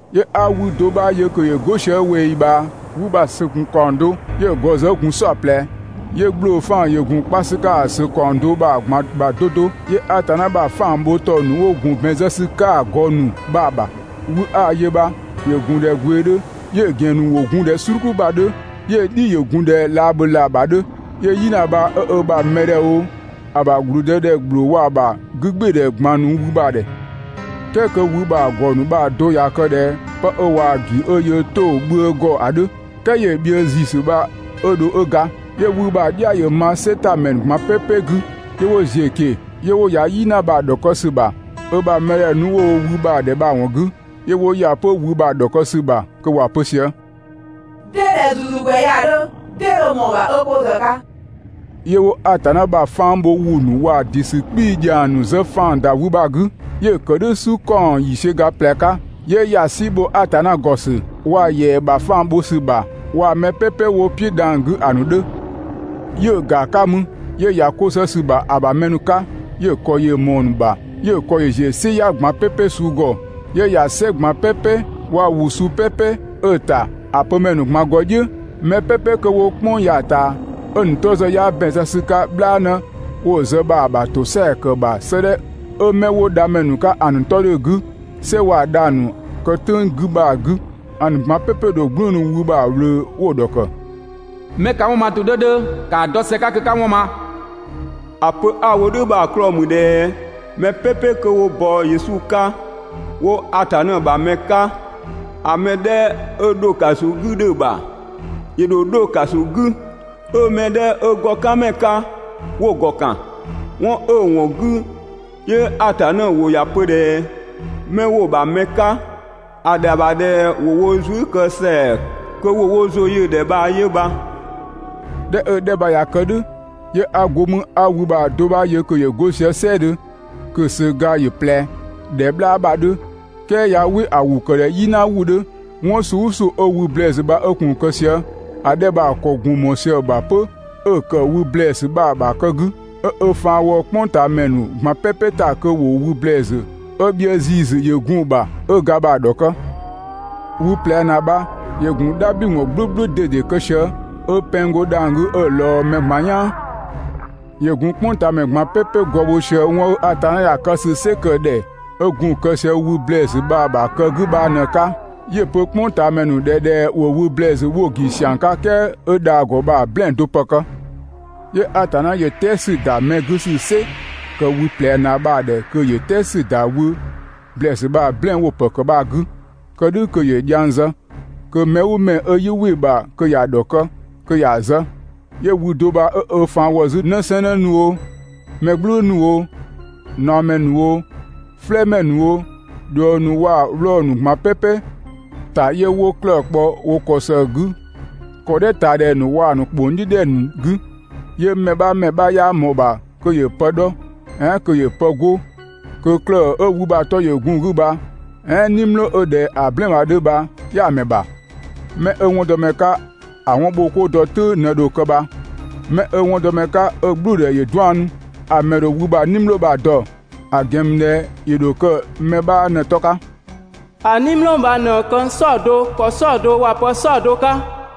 'Yö 'a wü do 'bha yö kö ‑yö 'go sië ꞊weeyi ꞊bhaa. Wü bha‑ ‑sö ‑gun ‑kaɔng do, 'yö‑ ‑gɔ ‑zë 'ö gun "saɔplɛ. 'Yö ‑gblofaan ‑yö gun kpa ‑sü 'ka‑ ‑sö ‑kaɔng do bha‑ ꞊gban ‑bha 'do 'do. 'Yö Atanna ‑bha 'fang bho ‑tɔ ‑nu 'wo gun ‑bɛn zë ‑sü 'ka‑ ‑gɔ ‑nu bha‑ ‑bha. Wü 'a‑ yö bha ‑yö ‑gun ꞊dhɛ gwee 'dhö, 'yö‑ ‑gɛn ‑nu 'wo gun ꞊dhɛ "sluku ‑bha 'dhö, 'yö‑ "dhi ‑yö gun ꞊dhɛ laabhölaa ‑bha 'dhö. 'Yö "yina bha 'ö ö ‑bha mɛdhɛ oo, ‑a ‑bha ‑blüdëdhɛ ‑gbloo waa‑ ‑bha 'gügbɩɩdhɛ ꞊gban nu wü bha‑ ‑dhɛ. "Kɛɛ kö wü bha‑ ‑gɔ ‑nu bha‑ do ꞊ya kë ꞊dhɛ pë 'ö ꞊waa‑ ‑gi 'ö yöö 'to‑ bhië ‑gɔ ‑a 'dhö. "Kɛɛ 'yö‑ bhië ‑ziisü bha 'ö dho 'ö ga. 'Yö wü bha‑ "dhia ‑yö ma "sɛ ‑ta ‑mɛ ꞊gban "pɛpɛ 'gü 'yö 'wo ‑ziö ꞊keng‑. 'Yö 'wo ‑ya "yina bha‑ ‑dhɔkë ‑sü ‑bha ö ‑bha mɛdhɛ nu 'ö‑ wo wü bha‑ ‑dhɛ bha‑ ‑wɔn 'gü. 'Yö 'wo ‑ya 'pö wü bha‑ ‑dhɔkë ‑sü ‑bha kö ‑wa pö sië: «'Dee ꞊dhɛ ‑zuzugwɛ ya‑ 'dhö? 'Dee dho ꞊mɔɔ‑ ‑bha 'ö 'ko zë‑ 'ka?» 'Yö 'wo Atanna ‑bha 'fang bho ‑wʋ ‑nu waa‑ ‑dɩ ‑sü 'kpii‑ ‑dhiang ‑nu zë ‑faan ‑da wü bha‑ 'gü. 'Yö‑ ‑kë "dhʋ̈ "su ‑kaɔng ‑yiisiö ga ꞊plɛ 'ka. 'Yö ‑ya "si ‑bho Atanna ‑gɔ ‑sü waa‑ ‑yɛa ‑bha 'fang bho ‑sü ‑bha waa‑ mɛ "pɛpɛ 'wo‑ "piʋ̈ dhang‑ 'gü ‑a ‑nu 'dhö. 'Yö‑ ‑ga 'ka mü 'yö ‑ya 'ko zë ‑sü ‑bha ‑a ‑bha mɛ ‑nu 'ka, 'yö‑ ‑kɔ ‑yö ꞊mɔɔ‑ ‑nu ‑bha, 'yö‑ ‑kɔ ‑yö ‑ziö "siya ꞊gban "pɛpɛ suu ‑gɔ, 'yö ‑ya "sɛ ꞊gban "pɛpɛ waa‑ ‑wʋ suu "pɛpɛ 'ö‑ ‑ta ‑a pö ‑mɛ ‑nu ꞊gban ‑gɔ "dhiʋ̈. Mɛ "pɛpɛ kö 'wo "kpʋng ya‑ ꞊taa, 'ö‑ ‑nu 'tɔ ‑zë 'yaa ‑bɛn zë ‑sü 'ka "bhlaanë 'wo‑ zë bha‑ ‑bha ‑tosɛa ‑kë ‑bha 'sëëdhɛ 'ö 'mɛ 'wo dha ‑mɛ ‑nu 'ka ‑a ‑nu 'tɔ 'dhö‑ 'gü, "sɛ waa‑ dhang‑ ‑nu kë "tʋ̈ng 'gü bha‑ 'gü, ‑a ‑nu ꞊gban "pɛpɛ‑ ‑dho "gblëënu wü bha‑ ꞊wlöö 'wo‑ ‑dhɔkë: 'Mɛ ka 'wɔn ma ‑tʋ 'dhö 'dhö, ‑kaa dɔ ‑së 'ka kö 'ka 'wɔn ma! ‑A pö 'a‑ wo "dhʋ̈ bha‑ 'klɔɔ‑ ‑mü ꞊dhɛ mɛ "pɛpɛ 'kö 'wo bɔ Yesu 'ka 'wo Atanna ‑bha mɛ 'ka, ‑a mɛ 'dhɛ 'ö ‑dho ‑kaso 'gü 'dhö‑ ‑bha, ‑yö ‑dho 'dho ‑kaso 'gü, 'ö‑ mɛ 'dhɛ 'ö ‑gɔkanmɛ 'ka 'wo‑ ‑gɔ ‑kan. 'Wɔn 'ö‑ ‑wɔn 'gü, 'yö Atanna ‑wʋ ‑ya pö ꞊dhɛ 'mɛ 'wo‑ ‑bha mɛ 'ka ‑a ‑dhɛa ‑bha ꞊dhɛ ‑wo wo zuë" kë ‑sɛa kö ‑wo wo ‑zʋ yö‑ ‑dhɛ bha 'yö bha. ꞊Dhɛ 'ö‑ 'dhɛ bha ꞊ya kë "dhʋ̈, 'yö 'a go mü 'a wü bha‑ do 'bha yö kö ‑yö 'go sië "sɛɛdhö, kö‑ ‑söga ‑yö ꞊plɛ ꞊dhɛ "bhlaa ‑bha 'dhö, "kɛɛ ꞊ya "wɩ ‑a ‑wʋ ‑kë ꞊dhɛ "yina ‑wʋ 'dhö. 'Wɔn suu "ʋʋ suu 'ö wü ‑blɛɛsü bha 'ö gun‑ kë sië, ‑a 'dhɛ bha‑ ‑kɔ ‑gun ꞊mɔɔ sië‑ ‑bha 'pö 'ö‑ ‑kë wü ‑blɛɛsü bha‑ ‑bha kë 'gü, 'ö ö faan ‑wɔ "kpʋngtaamɛ ‑nu ꞊gban "pɛpɛ ‑ta kö ‑wo wü ‑blɛɛsü 'ö bhië ‑ziisü ‑yö gun‑ ‑bha 'ö ga bha‑ ‑dhɔkë. Wü ꞊plɛ ‑naa bha ‑yö gun "dhabhliwɔn "gblʋ̈gblʋ̈ ꞊dede kë sië, 'ö pɛng go dhang‑ 'gü 'ö‑ ꞊lɔɔ mɛ ꞊gban "yaan. ‑Yö ‑gun "kpʋngtaamɛ ꞊gban "pɛpɛ gɔɔ bho sië 'wɔn 'ö Atanna ‑ya kë ‑sü "sɩ ‑kë ‑dhɛ 'ö gun‑ kë sië wü ‑blɛɛsü bha‑ ‑bha kë 'gü bha ꞊në‑ 'ka, 'yö‑ pö "kpʋngtaamɛ ‑nu ‑dhɛ ꞊dhɛ ‑wo wü ‑blɛɛsü 'wo‑ ‑gi ‑siang 'ka "kɛɛ 'ö dha‑ ‑gɔ bha‑ "blɛɛn‑ do ‑pë ‑kë. 'Yö Atanna ‑yö "tɛɛ ‑sü ‑da mɛ 'gü ‑sü "sɩ ‑kë wü ꞊plɛ ‑naa bha‑ ‑dhɛ 'yö "tɛɛ ‑sü ‑da wü ‑blɛɛsü bha‑ "blɛɛn‑ 'wo‑ ‑pë ‑kë bha‑ 'gü, kë "dhʋ̈ kö ‑yö dhiang zë kö mɛ "ʋʋ mɛ 'ö 'yii "wɩ‑ ‑bha kö ‑ya ‑dhɔkë, kö ‑ya zë. 'Yö wü do bha 'ö ö faan ‑wɔ 'zü 'në 'sɛɛnnë ‑nu oo, mɛ "gblʋ̈gblʋ̈ ‑nu oo, ꞊naɔmɛ ‑nu oo, "flɛɛmɛ ‑nu oo, ꞊dhuëng ‑nu waa‑ 'wlɔɔ‑ ‑nu ꞊gban "pɛpɛ ‑ta 'yö 'wo 'klëë‑ kpɔ wo ‑kɔ ‑së 'gü ‑kɔdhɛ ꞊taa ‑dhɛ ‑nu waa‑ ‑nu ‑kpong "dhiʋ̈ ‑dhɛ ‑nu 'gü. 'Yö mɛ 'bha ‑mɛ 'bha 'yaa ꞊mɔɔ‑ ‑bha kö ‑yö pë 'dhɔ, "ɛɛn kö ‑yö pë 'go, kö 'klëë‑ 'ö wü bha‑ 'tɔ ‑yö gun‑ 'gü bha, "ɛɛn "nimlɔɔ 'ö ꞊dhɛ‑ "blɛɛn‑ bha‑ 'dhö bha 'yaa‑ ‑mɛ ‑bha. 'Mɛ 'ö 'wɔndɔmɛ 'ka ‑a 'wɔn ‑bho 'koo dɔ "tʋ̈ng ꞊në dho kë bha. 'Mɛ 'ö 'wɔndɔmɛ 'ka 'ö‑ "gblʋ̈ʋ̈dhɛ ‑yö 'daɔnnu, ‑a ‑mɛ ‑dho wü bha‑ "nimlɔɔ bha‑ dɔ, ‑a ‑gɛn ‑mü ꞊dhɛ ‑yö ‑dho kë mɛ 'bha ꞊në‑ 'tɔ 'ka. ‑A "nimlɔɔ bha ꞊në këng "saɔdo ‑kɔ "saɔdo waa‑ pë "saɔdo 'ka.